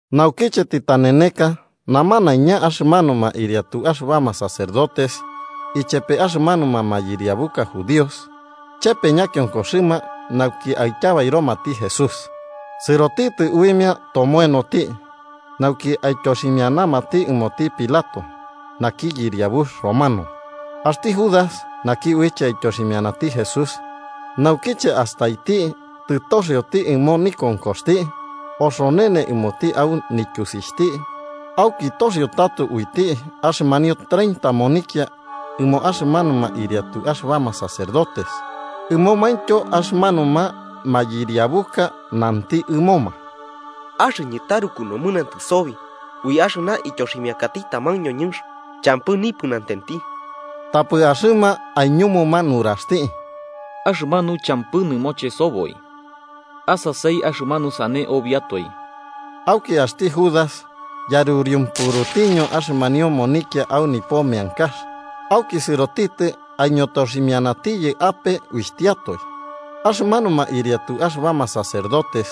Naukiche tɨtaneneka, namanaiña axɨmanuma ɨriatu axɨbama sacerdotes ichepe axɨmanuma mayɨriabuka judíos chépe ñakionkoxɨma nauki aityabairomati Jesús. Sɨrotitɨ uimia tomoenoti nauki aityoximianamati ɨmoti Pilato, naki yɨriabux romano. Axti Judas, naki uiche aityoximianati Jesús, naukiche astaiti tɨtoxioti ɨmo nikonkoxti, oxonene ɨmoti au nityusixhti auki toxio tato uiti axɨmanio treinta monikia ɨmo axɨmanuma ɨriatu axɨbama sacerdotes ɨmomaintyo axɨmanuma mayɨriabuka, nanti ɨmoma: –Axɨñɨ taruku nomɨnantɨ sobi ui axɨna ityoximiakati taman ñoñɨnx champɨ nipɨnatenti. Tapɨ axɨma aiñumuma nuraxti: –¿Axɨmanu champɨ nɨmoche soboi? ¡Asasai axɨmanu sane obiatoe! Auki axti Judas yaruriumpurutiño axɨmanio monikia au nipo meankax, auki sɨrotitɨ aiñotoximianatiyɨ ape uixhtiatoe. Axɨmanuma ɨriatu axɨbama sacerdotes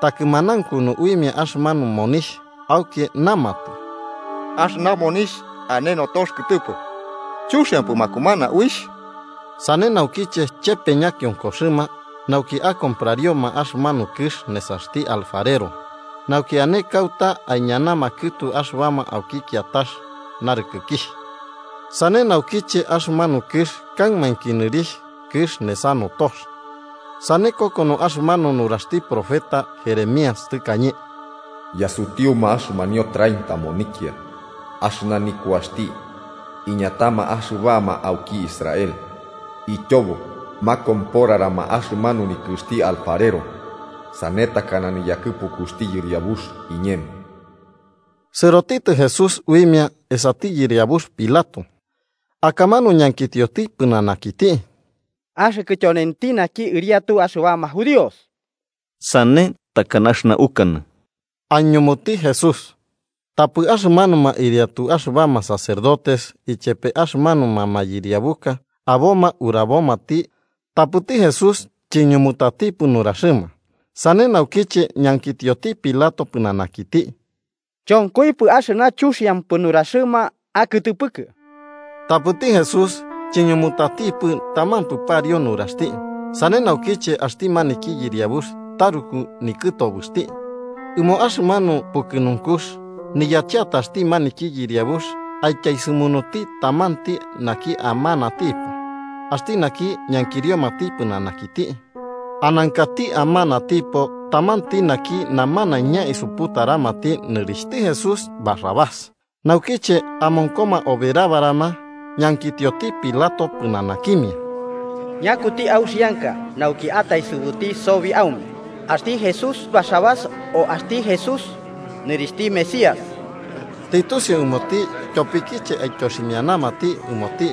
takɨmanaunkunu uimia axɨmanu monixh, auki namatɨ: –Axɨna monixh ane notox kɨtɨpɨ. Chuxiampɨ makumana uixh. Sane naukiche chepe ñakionkoxɨma nauki akomprarioma axɨmanu kɨx nesaxti Alfarero, nauki ane kauta aiñanama kɨtu axɨbama auki kiatax narɨkɨkixh. Sane naukiche axɨmanu kɨx kaɨmainki nɨrixh Kɨx nesa Notox. Sane kokono axɨmanu nuraxti profeta Jeremías tɨkañe: “Yasutiuma axɨmanio treinta monikia, axɨna nikuaxti iñatama axɨbama auki Israel, ityobo makomporarama axɨmanu nikɨxti alfarero, sane takana niyakɨpukuxti Yɨriabux iñemo.” Sɨrotitɨ Jesús uimia esati yɨriabux Pilato, akamanu ñankitioti pɨnanakiti: –¿Axɨkɨ tyonenti naki Ɨriatu axɨbama judíos? –Sane takana axɨna ukanɨ–aiñumutati Jesús. Tapɨ axɨmanuma ɨriatu axɨba sacerdotes ichepe axɨmanuma mayɨriabuka aboma urabomati, tapɨti Jesús chiñumutatipɨ nuraxɨma. Sane naukiche ñankitioti Pilato pɨnanakiti: –¿Chonkoipɨ axɨna chuxiampɨ nuraxɨma akɨtɨpɨkɨ? Tapɨti Jesús chiñumutatipɨ tamampɨ pariu nuraxti. Sane naukiche axti maniki yɨriabux taruku nikɨtobɨxti. Ɨmo axɨmanu pukɨnunkux, niyacheataxti maniki yɨriabux aityaesɨmunuti tamanti naki amanatipo, axti naki ñankiriomati pɨnanakiti. Anankati amanatipo tamanti naki namanaiña isuputaramati nɨrixhti Jesús Barrabás. Naukiche amonkoma oberabarama, ñankitioti Pilato pɨnanakimia: –¿Ñakuti auxianka nauki ataesɨbuti sobi aume: axti Jesús Barrabás o axti Jesús, nɨrixhti Mesías? Tɨtusiu ɨmoti tyopikiche aityoximianamati ɨmoti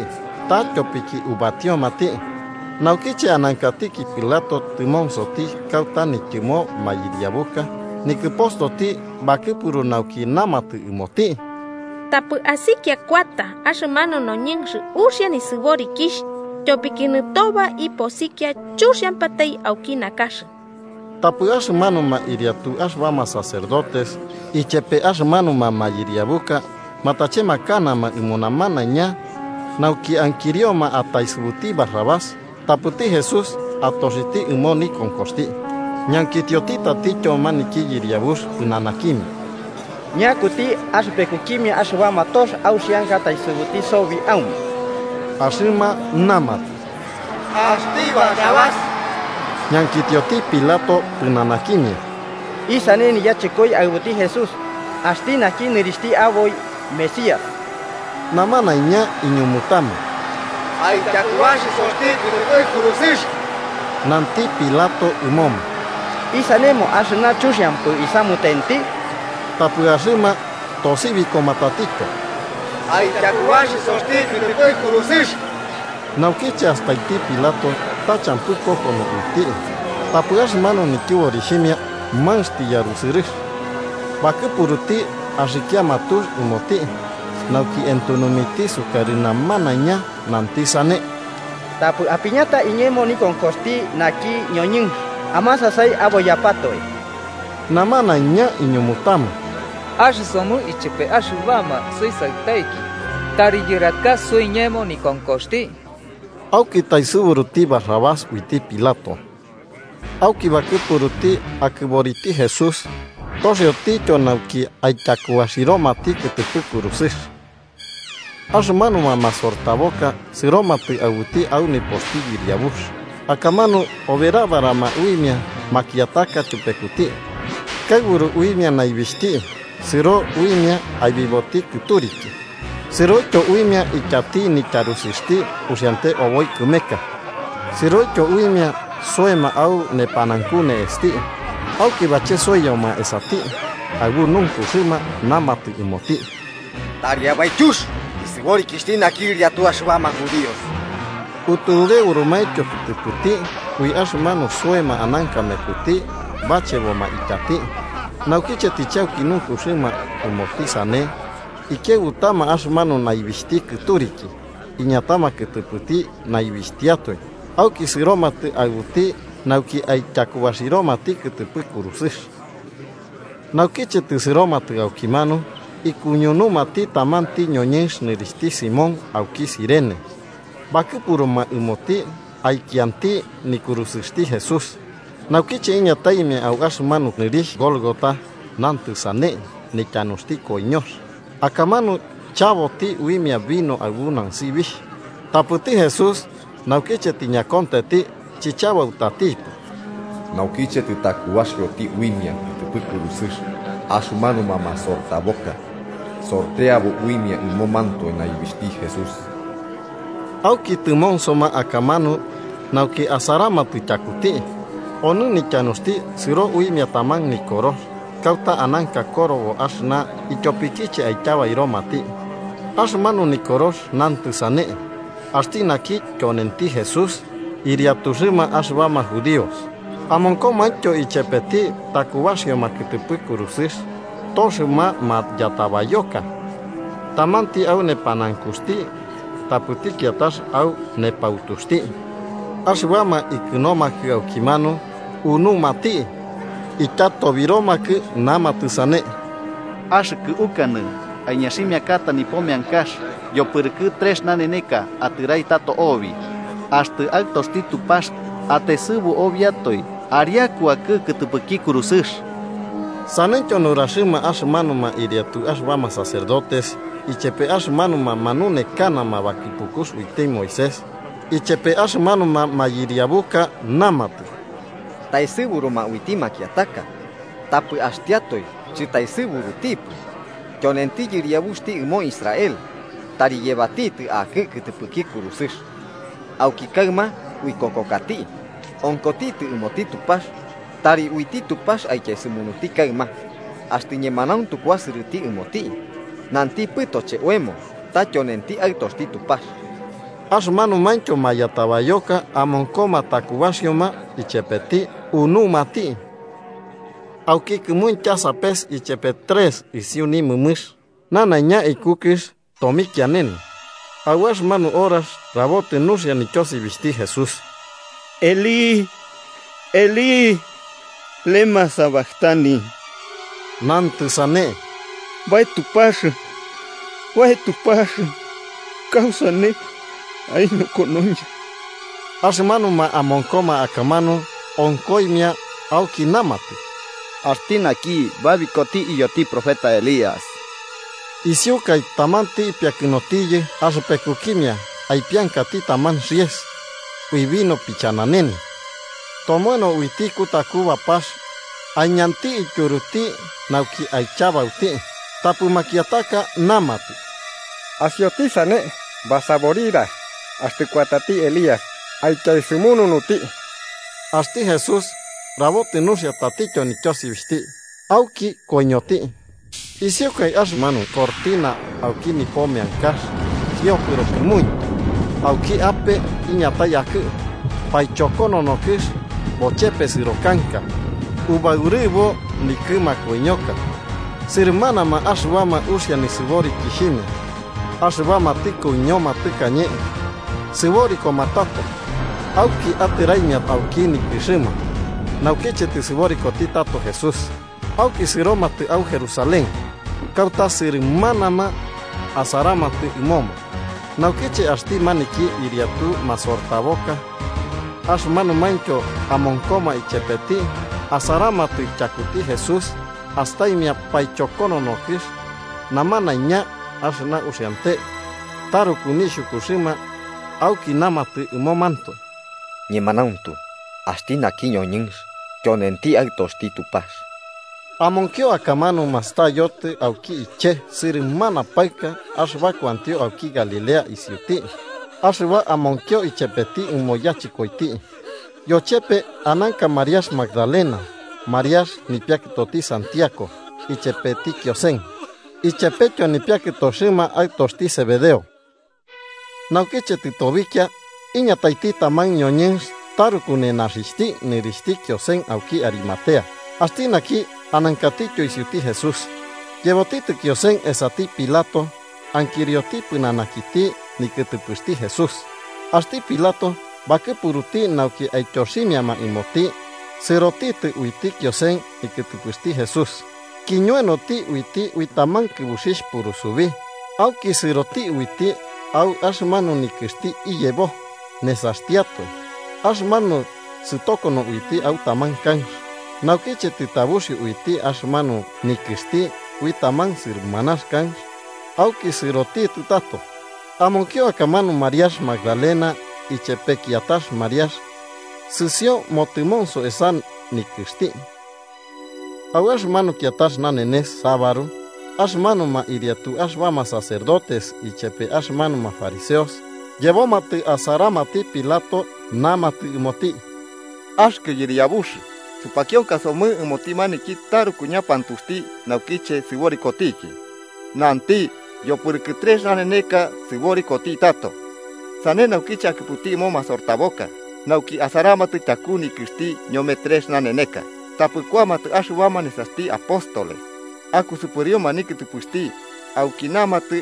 ta tyopiki ubatiomati. Naukiche anankatiki Pilato tɨmonsoti kauta nityɨmo mayɨriabuka, nikɨpostoti bakɨpuru nauki namatɨ ɨmoti: “Tapɨ asikia kuata axɨmanu noñɨnx uxia nisɨborikixh, tyopiki nɨtoba iposikia chuxiampatai auki nakax.” Tapɨ axɨmanuma ɨriatu axɨbama sacerdotes ichepe axɨmanuma mayɨriabuka matachemakanama ɨmo namanaiña nauki ankirioma ataesɨbuti Barrabás tapɨti Jesús atoxiti ɨmo nikonkoxti. Ñankitioti tatityo maniki yɨriabux pɨnanakimia: –¿Ñakuti axɨpekukimia axɨbama tox auxianka ataesɨbuti sobi aume? Axɨma namatɨ: –¡Axti Barrabás! Ñankitioti Pilato pɨnanakimia: –¿Isane niyachɨkoi aɨbuti Jesús, axti naki nɨrixhti aboi Mesías? Namanaiña iñumutama: –¡Aityakubaxisoti kɨtɨpɨ kurusɨx! Nanti Pilato ɨmoma: –¿Isanemo axɨna chuxiampɨ isamutenti? Tapɨ axɨma tosibikoma tatityo: –¡Aityakubaxisoti kɨtɨpɨ kurusɨx! Naukiche astaiti Pilato ta champɨ kokono uiti, tapɨ axɨmanu nityɨborixhimia manx tiyarusɨrɨx, bakɨpuruti akama tux ɨmoti nauki entunumiti sukarɨ namanaiña, nanti sane: –Tapɨ apiñata iñemo nikonkoxti naki ñoñɨnx. Amasasai aboiyapatoe. Namanaiña iñumutama: –¡Axɨsomɨ ichepe axɨbama suisaɨtaiki tari yɨraka suiñemo nikonkoxti! Auki taesɨburuti Barrabás uiti Pilato. Auki bakɨpuruti akɨboriti Jesús toxiotityo nauki aityakubaxiromati kɨtɨpɨ kurusɨx. Axɨmanuma masortaboka sɨromatɨ aɨbuti au nipoxti yɨriabux akamanu oberabarama uimia makiataka tyupekuti. Kaɨburu uimia naibixhti, sɨro uimia aibiboti kɨturiki sɨroityo uimia ityati nityarusɨxti uxiante oboi kɨmeka sɨroityo uimia soema au nepanaunku ne'esti. Auki bachesoiyoma esati, aɨbu nunkuxɨma namatɨ ɨmoti: –¡Tari abaityux nisɨborikixhti ɨriatu axɨbama judíos! Utureurumaityo kɨtɨpɨti, ui axɨmanu soema ananka mekuti bacheboma ityati. Naukiche tɨchauki nunkuxɨma ɨmoti sane, ikiaɨbutama axɨmanu naibixhti kɨturiki, iñatama kɨtɨpɨti naibixhtiatoe auki sɨromatɨ aɨbuti nauki aityakubaxiromati kɨtɨpɨ kurusɨx. Naukiche tɨsɨromatɨ aukimanu, ikuñunumati tamanti ñoñɨnx nɨrixhti Simón, auki Cirene, bakɨpuruma ɨmoti aikianti nikurusɨxti Jesús. Naukiche iñataimia au axɨmanu nɨrixh Gólgota, (nantɨ sane, “Nityanuxti koiñox”), akamanu chaboti uimia vino aɨbu nansibixh. Tapɨti Jesús, naukiche tiñakontenti, chichabautatipɨ. Naukiche tɨtakubaxioti uimia kɨtɨpɨ kurusɨx, axɨmanuma masortaboka sorteabo uimia ɨmomantoe naibixhti Jesús. Auki tɨmonsoma akamanu nauki asaramatɨ tyakuti. Onɨ nityanuxti sɨro uimia taman nikorox, kauta ananka korobo axɨna ityopikiche aityabairomati. Axɨmanu nikorox nantɨ sane: “Axti naki tyonenti Jesús, ɨriatuxɨma axɨbama Judíos.” Amonkomaintyo ichepeti takubaxioma kɨtɨpɨ kurusɨx toxɨma mayatabayoka, tamanti au nepanaunkuxti tapɨti kiatax au nepautuxti. Axɨbama ikɨnomakɨ aukimanu unumati, ityatobiromakɨ namatɨ sane: –¡Axɨkɨ ukanɨ aiñaximiakata nipo meankax yopɨrɨkɨ trex naneneka atɨrai tato obi! ¡Axtɨ axɨkɨ tyonenti Aɨtoxti Tupax, ataesɨbu obiatoe ariaku akɨ kɨtɨpɨki kurusɨx! Saneityo nuraxɨma axɨmanuma ɨriatu axɨbama sacerdotes ichepe axɨmanuma manunekanama bakɨpukux uiti Moisés, ichepe axɨmanuma mayɨriabuka. Namatɨ: 42–Taesɨburuma uiti makiataka, tapɨ axtiatoe chɨtaesɨburutipɨ. Tyonenti yɨriabuxti ɨmo Israel: ¡tari yebatitɨ akɨ kɨtɨpɨki kurusɨx, auki kaɨma uikokokati! Onkotitɨ ɨmoti Tupax: ¡tari uiti Tupax aityaesɨmunuti kaɨma, axtɨ ñemanauntu kuasɨrɨti ɨmoti! ¿Nantipɨtoche oemo ta tyonenti Aɨtoxti Tupax? Axɨmanumaintyo mayatabayoka amonkoma takubaxioma ichepeti, unumati. Auki kɨmuintya sapes ichepe trex isiu nimɨmɨx, nanaiña iku kɨx tomikianene. Au axɨmanu horax, rabotɨ nuxia nityosibixhti Jesús: “Eli, Eli, ¿lemá sabactani?” (nantɨ sane: “Bae Tupax, Bae Tupax, ¿kausane aiñokonoñɨ?”) Axɨmanuma amonkoma akamanu, onkoimia auki namatɨ: –Axti naki babikoti iyoti profeta Elías. Isiukai, tamanti ipiakɨnotiyɨ axɨpekukimia aipiankati taman xiese, ui vino pichananene, tomoeno uiti kutaku bapax aiñanti ityuruti nauki aichabauti. Tapɨ makiataka namatɨ: –Asioti sane, basaborira axtɨ kuatati Elías aityaesɨmununuti. Axti Jesús rabotɨ nuxia tatityo nityosibixhti, auki koiñoti. Isiukai axɨmanu cortina auki nipo meankax kiopɨro kɨmuintya, auki ape iñatai akɨ. Paichokonono kɨx bochepesɨro kanka ubaurɨbo nikɨ makoiñoka. Sɨrɨmanama axɨbama uxia nisɨborikixhimia, axɨbama tɨkoiñoma tɨkañe, sɨborikoma tato. Auki atɨraimia auki nikɨxɨma, naukiche tɨsɨborikoti tato Jesús, auki sɨromatɨ au Jerusalén, kauta sɨrɨmanama asaramatɨ ɨmoma. Naukiche axti maniki ɨriatu masortaboka axɨmanumaintyo amonkoma ichepeti asaramatɨ tyakuti Jesús astaimia paichokonono kɨx nanaiñaintyo axɨna uxiante, taruku nixhukuxɨma auki namatɨ ɨmomantoe: –¡Ñemanauntu axti naki ñoñɨnx tyonenti Aɨtoxti Tupax! Amonkio akamanu, mastayotɨ auki iche, sɨrɨmana paɨka axɨba kuantio auki Galilea isiuti axɨba amonkio ichepeti ɨmo yachɨkoiti. Yochepe ananka Mariax Magdalena, Mariax nipiakɨtoti Santiago ichepeti Kiosen, ichepetyo nipiakɨtoxɨma aɨtoxti Zebedeo. Naukiche tɨtobikia, iñataiti taman ñoñɨnx taruku nenaxixhti nɨrixhti Kiosen, auki Arimatea, axti naki anankatityo isiuti Jesús. Yebotitɨ Kiosen esati Pilato ankirioti pɨnanakiti nikɨtɨpɨxti Jesús. Axti Pilato bakɨpuruti nauki aityoximiama ɨmoti, sɨrotɨ uiti Kiosen nikɨtɨpɨxti Jesús, kiñoenoti uiti ui taman kɨbuxixh purusubi auki sɨroti uiti au axɨmanu nikɨxti iyebo, nesaxtiatoe, axɨmanu sɨtokono uiti au taman kanx. Naukiche tɨtabuxio uiti axɨmanu nikɨxti ui taman sɨrɨmanax kanx, auki sɨrotitɨ tato. Amonkio akamanu Mariax Magdalena ichepe kiatax Mariax sɨsioio motɨmonso esa nikɨxti. Au axɨmanu kiatax nanenes, sabaru, axɨmanuma ɨriatu axɨbama sacerdotes ichepe axɨmanuma fariseos yebomatɨ asaramati Pilato, namatɨ ɨmoti: –Axɨkɨ yɨriabux, supakionkasomɨ ɨmoti maniki taruku ñapantuxti, naukiche sɨborikotiki, nanti yopɨrɨkɨ trex naneneka sɨborikoti tato. Sane naukiche, akɨpu ɨmo masortaboka nauki asaramatɨ tyaku nikɨxti ñome trex naneneka, tapɨ kuamatɨ axɨbama nesaxti apóstoles akusɨpɨrioma nikɨtɨpɨxti, auki namatɨ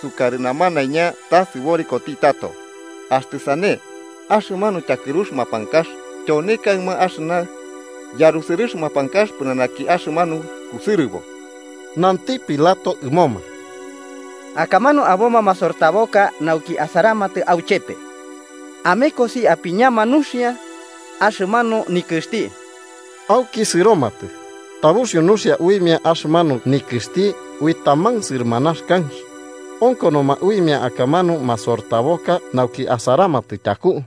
sukarɨ namanaiña ta sɨborikoti tato. Axtɨ sane, axɨmanu tyakɨrux mapankax tyone kaɨma axɨna yarusɨrɨx mapankax pɨnanaki axɨmanu kusɨrɨbo. Nanti Pilato ɨmoma: –Akamanu aboma masortaboka nauki asaramatɨ auchepe. Amekosi apiñama nuxia axɨmanu nikɨxti. Auki, sɨromatɨ, tabuxiu nuxia uimia axɨmanu nikɨxti ui taman sɨrɨmanax kanx. Onkonoma uimia akamanu masortaboka nauki asaramatɨ tyaku.